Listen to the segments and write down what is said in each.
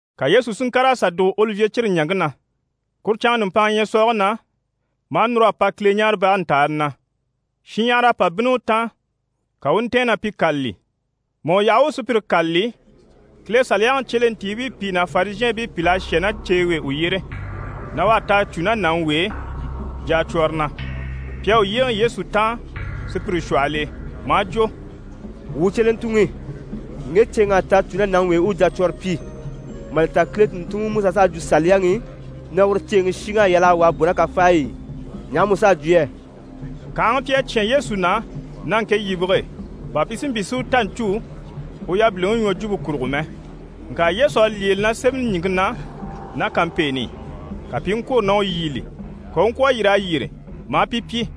Ka Yesu si ŋkàr'a sà dùgo Olivye cire ɲaŋke na. Kuru canŋa nùmpanŋa ɲyɛ̀sɔɔge na, maa núr'a pa Kileɲaarebage ntàani na. Shinɲyahara à pa bínni u taan, ka u u ntɛ̀ɛn na pi kâlali. Mà u yaha u u sùpyire kâlali, Kile Saliyaŋi cyelentiibii pìi ná Farizhɛɛnbii pìl'à shà ná ceewe e u yyére, na u à ta a cû ná nàŋi w'e jacwɔrɔ na. Pi à u yyéeŋɛ Yesu taan, sùpyire shwɔhɔl'e, maa jwo: «Wuu cyelentuŋi, ŋge ceeŋ'à ta a cû ná nàŋi w'e u u jacwɔɔre pyi. Mà li ta Kile tùnntunŋiMusa s'à jwo Saliyaŋi i na uru ceeŋi shiŋ'à yal'a wà a bò ná kafaay'e. Ɲaha mu s'à jwo yɛ?» Kànhaŋa pi à cyán Yesu na ná ŋke yibige e, bà pi si mpyi si u ta ɲcû u yabiliŋi ɲwɔjwumpe kurugo mɛ. Ŋka Yesu à lyêele na sémɛni ɲìŋke na ná kampeeni i. Ka pi i ŋkwôro na u yíbili. Ka u u ŋkwɔ̀ a yîr'a yyére maa pi pyi: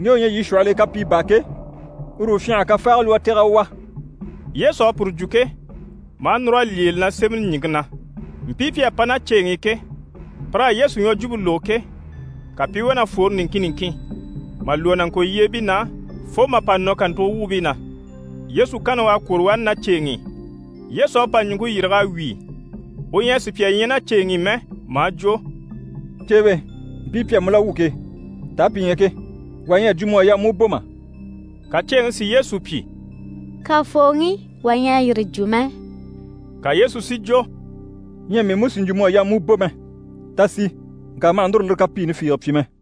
«Ŋge u ɲyɛ yii shwɔhɔl'e kapii baa ke, uru u fyânha a kafaaga lwɔ́ a tɛ̀g'a u wà.» Yesu à puru jwo ke, maa núr'a lyêele na sémɛni ɲìŋke na. Mpii pi à pa ná ceeŋi i ke, pir'à Yesu ɲwɔjwumpe lógo ke, ka pi i wá na fwore niŋkin niŋkin, mà lwɔ́ nàŋkolyeebii na fo mà pa nɔ kàntugo wuubii na. Yesu kanni u à kwôro wani ná ceeŋi i. Yesu à pa ɲùŋke yîrig'a wíi, u ɲyɛ a sùpya ɲya ná ceeŋi i mɛ, maa jwo: «Ceewe, mpii pi à mu la wwû ke, taa pi ɲyɛ ke? Wà ɲyɛ a jwo mu à yaa mu u bò mà?» Ka ceeŋi si Yesu pyi: «Kafooŋi, wà ɲyɛ a yire jwo mɛ.» Ka Yesu si jwo: «Ɲyɛ mii mú sì n‑jwo mu à yaa mu u bò mɛ. Ta sì, ŋka ma hà núru lire kapiini fiige pyi mɛ.»]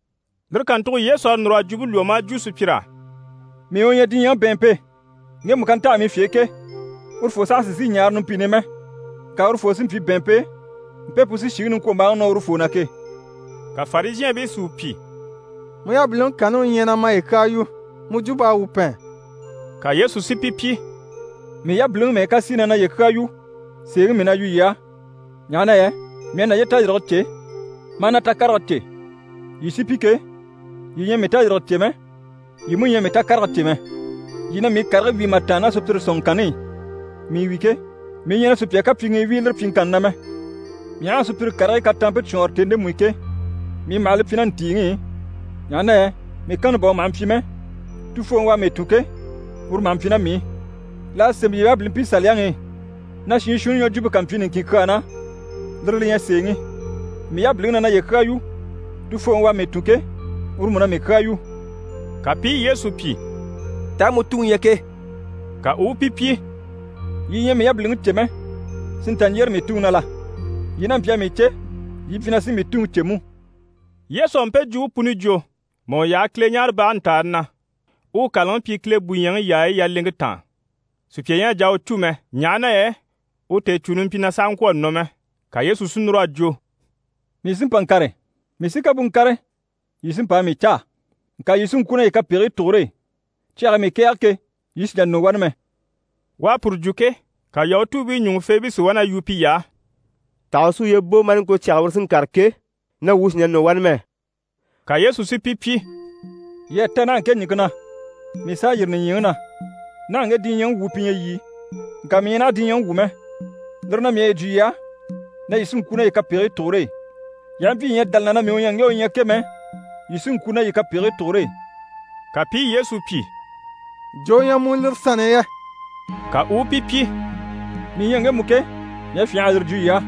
Lire kàntugo Yesu à núr'a jwumpe lwɔ́ maa jwo sùpyir'á: «Mii u ɲyɛ diɲyɛŋi bɛ̀ɛnmpe. Ŋgemu ká ntaha mii fye e ke, urufoo saha sì n‑sìi ɲaare numpini i mɛ, ŋka urufoo sí n‑pyi bɛ̀ɛnmpe e mpe pu sí shìŋi niŋkwombaaŋi nɔ urufoo na ke.» Ka Farizhɛɛnbii si u pyi: «Mu yabiliŋi kanni u ɲyɛ na maye kyaa yu, mu jwump'à wuu pɛn.» Ka Yesu si pi pyi: «Mii yabiliŋi mɛ́ɛ ká sí i na naye kyaa yu, sèeŋi mii na yu yii á, ɲaha na yɛ mii à naye tayirige cè, maa na takarege cè. Yii sí pi ke, yii ɲyɛ a mii tayirige cè mɛ, yii mú ɲyɛ a mii takarege cè mɛ. Yii na mii karigii wíi mà tàanna ná sùpyire sɔ̀nŋɔŋkanni i. Mii wi ke, mii ɲyɛ na sùpya kapyiŋii wíi lire pyiŋkanni na mɛ. Mii aha a sùpyire karigii kataampe cwɔɔnre tèni ndemu i ke, mii maha li pyi ná ntìiŋi i, ɲaha na yɛ mii kanni bà u maha mpyi mɛ, Tufooŋi u à mii tun ke, uru maha mpyi ná mii i. L'à sémɛ yii yabilimpii Saliyaŋi i, na shiin shuunni ɲwɔjwumpe ká mpyi niŋkin kyaa na, lire li ɲyɛ sèeŋi. Mii yabiliŋi na naye kyaa yu, Tufooŋi u à mii tun ke, uru mú na mii kyaa yu.» Ka pi i Yesu pyi: «Taa mu tuŋi ɲyɛ ke?» Ka u u pi pyi: «Yii ɲyɛ a mii yabiliŋi cè mɛ, si nta ɲjyére mii Tuŋi na la? Yii n'a mpyi a mii cè, yii mpyi na sí mii Tuŋi cè mú.» Yesu à mpe jwumpe puni jwo mà u yaha Kileɲaarebage ntàani na u u kàlaŋi pyi Kile bùɲyɛŋi yaayi yaleŋke taan. Sùpya ɲyɛ a jà a u cû mɛ, ɲaha na yɛ u tèecûni mpyi na sàha ŋkwɔ̀ a nɔ mɛ. Ka Yesu si núr'a jwo: «Mii sí n‑pa n‑kàre, mii sí ká bú n‑kàre, yii sí n‑pa a mii caa. Ŋka yii sí n‑kwû ná yii kapegigii tugure e. Cyage e mii kɛ̀ɛge ke, yii sì n‑jà nɔ wani mɛ.» U à puru jwo ke, ka Yahutuubii ɲùŋufeebii si wá na yu piy'á: «Taha u sí uye bò maa ŋko na cyage e uru sí n‑kàre ke, na wuu sì n‑jà nɔ wani mɛ?» Ka Yesu si pi pyi: «Yii à ta naha ŋke ɲìŋke na, mii s'à yîri nìɲyiŋi na. Naha ŋge diɲyɛŋi wuu pi ɲyɛ yii, ŋka mii ɲyɛ naha diɲyɛŋi wu mɛ. Lire na, mii à yi jwo yii á na yii sí n‑kwû ná yii kapegigii tugure e. Yii aha mpyi yii ɲyɛ a dá li na na “Mii u ɲyɛ ŋge u ɲyɛ ke” mɛ, yii sí n‑kwû ná yii kapegigii tugure e.» Ka pi i Yesu pyi: «Jo u ɲyɛ mu lire sanni i yɛ?» Ka u u pi pyi: «Mii ɲyɛ ŋgemu ke, mii à fyânha a yire jwo yii á.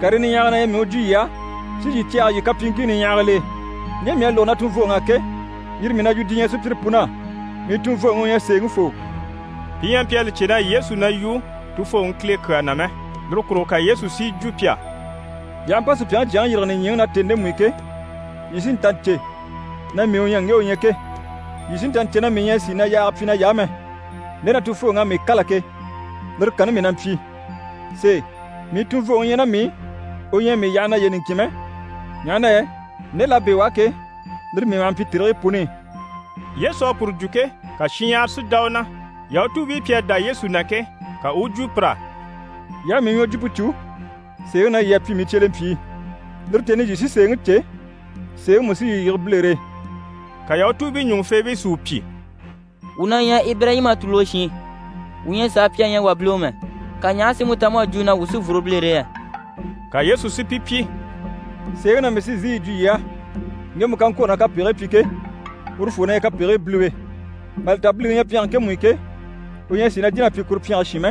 Karii niɲyahagii na ɲyɛ mii u jwo yii á si yii cɛ̂ɛgɛ yii kapyiiŋkii niɲyahagil'e. Ɲje mii à lógo na tunvooŋ'á ke, yire mii na yu diɲyɛ sùpyire pun'á. Mii tunvooŋi u ɲyɛ sèeŋifoo.» Pi ɲyɛ a mpyi a li cè na Yesu na yu Tufooŋi Kile kyaa na mɛ. Lire kurugo ka Yesu si yi jwo pi á: «Yii aha mpa Supyaŋi Jyaŋi yîrige nìɲyiŋi na tèni ndemu i ke, yii sí n‑ta n‑cè na “Mii u ɲyɛ ŋge u ɲyɛ ke.” Yii sí n‑ta n‑cè na mii ɲyɛ a sìi na yaage pyi nay'á mɛ, nde na Tufooŋi à mii kâla ke, lire kanni mii na mpyi. Sèe, mii tunvooŋi ɲyɛ ná mii i, u ɲyɛ a mii yaha naye niŋkin mɛ, ɲaha na yɛ nde l'à bɛ̂ u á ke, lire mii maha mpyi tèrigii puni i.» Yesu à puru jwo ke, ka shinɲyahara si dá u na. Yahutuubii pi à dá Yesu na ke, ka u u jwo pir'á: «Yii aha mii ɲwɔjwumpe cû, sèeŋi na yii à pyi mii cyelempyii. Lire tèni i, yii sí sèeŋi cè, sèeŋi mú sí yii yige bilere e.» Ka Yahutuubii ɲùŋufeebii si u pyi: «Wuu na ɲyɛ Ibirayima tùluge shiin. Wuu ɲyɛ a sàa pyi a ɲya wà biliwe mɛ, ka ɲaha sí mu ta mu à jwo na wuu sí n‑fworo bilere e yɛ?» Ka Yesu si pi pyi: «Sèeŋi na mii sí n‑sìi yi jwo yii á, ŋgemu ká ŋkwôro na kapegigii pyi ke, urufoo na ɲyɛ kapegigii biliwe. Mà li ta biliŋi ɲyɛ pyɛnge ŋkemu i ke, u ɲyɛ a sìi na jìn'a pyi kuru pyɛnge shin mɛ,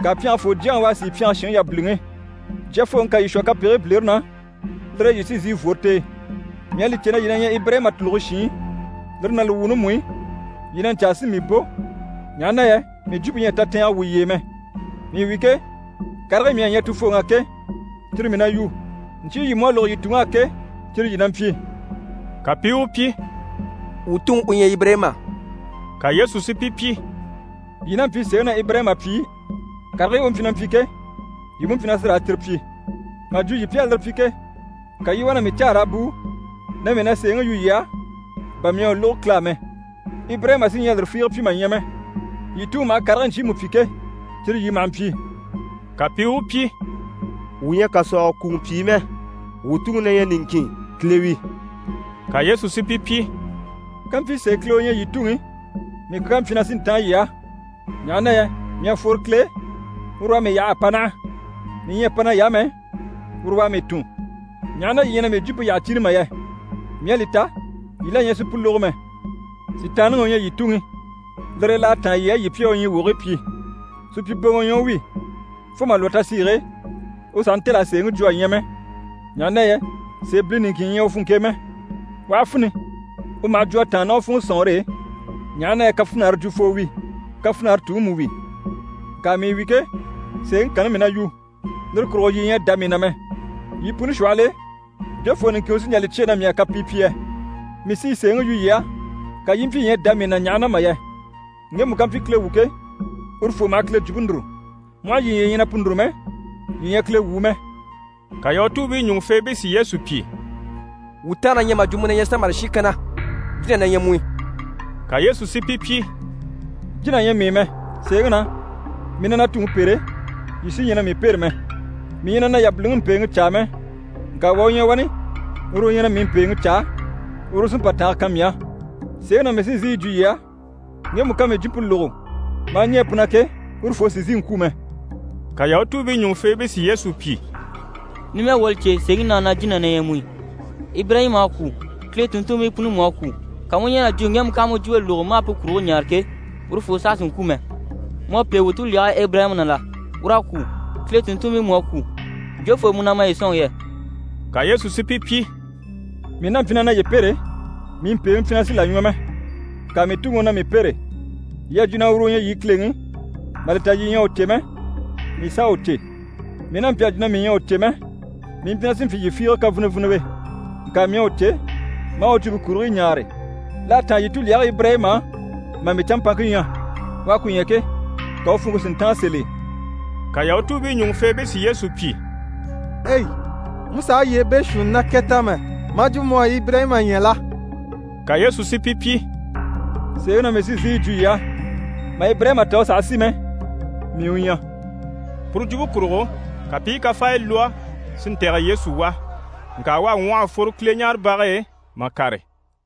ŋka pyɛngefoo jyaŋi u à sìi pyɛnge shinŋi yabiliŋi. Jyafooŋi ká yii shwɔ kapegigii bilere na, lire e yii sí n‑sìi n‑fworo t'e. Mii à li cè na yii na ɲyɛ Ibirayima tùluge shiin, lire ná li wuuni mú i, yii na ɲcaa si mii bò, ɲaha na yɛ mii jwumpe ɲyɛ a tatɛɛngɛ wwû yii e mɛ. Mii wi ke, karigii mii à ɲya na Tuŋi á ke, cyire mii na yu. Ɲcyii yii mú à lógo yii tuŋ'á ke, cyire yii na mpyi.» Ka pi i u pyi: «Wuu tuŋi u ɲyɛ Ibirayima.» Ka Yesu si pi pyi: «Yii n'a mpyi sèeŋi na Ibirayima pyìi, karigii u mpyi na mpyi ke, yii mú mpyi na sí raa cyire pyi. Mà jwo yii pi à lire pyi ke, ka yii i wá na mii caa raa bùu na mii na sèeŋi yu yii á, bà mii à u lógo Kile á mɛ. Ibirayima sí ɲyɛ a lire fiige pyi mà ɲya mɛ. Yii tuŋi maha karigii ɲcyiimu pyi ke, cyire yii maha mpyi.» Ka pi i u pyi: «Wuu ɲyɛ kàsɔɔgɔ kùŋɔ pyìi mɛ. Wuu Tuŋi na ɲyɛ niŋkin, Kile wi.» Ka Yesu si pi pyi: «Kàmpyi sèe Kile u ɲyɛ yii Tuŋi, mii kyaa mpyi na sí n‑táan yii á, ɲaha na yɛ mii à fworo Kile e, uru u à mii yaha a pa naha. Mii ɲyɛ a pa nay'á mɛ, uru u à mii tun. Ɲaha na yii ɲyɛ na mii jwumpe yyaha cìni mà yɛ? Mii à li ta, yii la ɲyɛ sì pu lógo mɛ. Sitaanniŋi u ɲyɛ yii tuŋi, lire e l'à táan yii á, yii pi a u ɲyii wogigii pyi. Supyiboŋɔ u ɲyɛ u wi, fo mà lwɔ́ tasiige e, u sàha ntêl'a sèeŋi jwo a ɲya mɛ, ɲaha na yɛ sèebili niŋkin ɲyɛ u funŋke e mɛ. U aha fini, u maha jwo a tàanna ná u funŋɔ sɔ̀nŋɔre e, ɲaha na yɛ kafinare jwufoo wi, kafinare tuŋi mú wi. Ŋka mii wi ke, sèeŋi kanni mii na yu, lire kurugo yii ɲyɛ a dá mii na mɛ. Yii puni shwɔhɔl'e, jofoo niŋkin u sí n‑jà li cyêe na mii à kapii pyi yɛ? Mii sí i sèeŋi yu yii á, ka yii i mpyi yii ɲyɛ a dá mii na ɲaha na mà yɛ? Ŋgemu ká mpyi Kile wu ke, urufoo maha Kile jwumpe núru. Mu aha yii ɲya yii ɲyɛ na pu núru mɛ, yii ɲyɛ Kile wuu mɛ.» Ka Yahutuubii ɲùŋufeebii si Yesu pyi: «Wuu tànga na ɲyɛ mà jwo mu na ɲyɛ Samari shin kanna, jína na ɲyɛ mu i.» Ka Yesu si pi pyi: «Jína ɲyɛ mii i mɛ. Sèeŋi na, mii na na Tuŋi pêre, yii sí ɲyɛ na mii pêre mɛ. Mii ɲyɛ na na yabiliŋi mpèeŋi caa mɛ, ŋka wà u ɲyɛ wani, uru u ɲyɛ na mii mpèeŋi caa, uru u sí n‑pa tànge kan mii á. Sèeŋi na mii sí n‑sìi yi jwo yii á, ŋgemu ká mii jwumpe lógo maa ɲɛɛ pu na ke, urufoo sì n‑sìi n‑kwû mɛ.» Ka Yahutuubii ɲùŋufeebii si Yesu pyi: «Numɛ wuu à li cè sèeŋi na na jína na ɲyɛ mu i. Ibirayima à kwû, Kile tùnntunmpii puni mú à kwû, ka mu u ɲɛn'a jwo na ŋgemu ká mu jwumpe lógo maa pu kurigii ɲaare ke, urufoo saha sì n‑kwû mɛ. Mu à pêe wuu tulyage Ibirayima na la? Ur'à kwû, Kile tùnntunmpii mú à kwû. Jofoo mu na maye sɔ̂nŋi yɛ?» Ka Yesu si pi pyi: «Mii n'a mpyi na naye pêre, mii mpèeŋi mpyi na sì là ɲwɔ mɛ. Ŋka mii Tuŋi u na mii pêre. Yii à jwo na uru u ɲyɛ yii Kileŋi, mà li ta, yii ɲyɛ a u cè mɛ, mii s'à u cè. Mii n'a mpyi a jwo na mii ɲyɛ a u cè mɛ, mii mpyi na sí n‑pyi yii fiige kafiniviniwe. Ŋka mii à u cè, maa u jwumpe kurigii ɲaare. L'à táan yii tulyage Ibirayima á mà mii canmpaŋke ɲya. U à ku ɲya ke, ka u funŋke si ntáan sèl'e.» Ka Yahutuubii ɲùŋufeebii si Yesu pyi: «Ei! mu sàha yyee beeshuunni ná kɛ ta mɛ, maa jwo mu à Ibirayima ɲya la?» Ka Yesu si pi pyi: «Sèeŋi na mii sí n‑sìi yi jwo yii á, mà Ibirayima ta u sàha si mɛ “Mii u ɲyɛ.”» Puru jwumpe kurugo, ka pi i kafaaya lwɔ́ si ntɛ̀gɛ Yesu wà, ŋka u à ŋwɔh'a fworo Kileɲaarebage e mà kàre.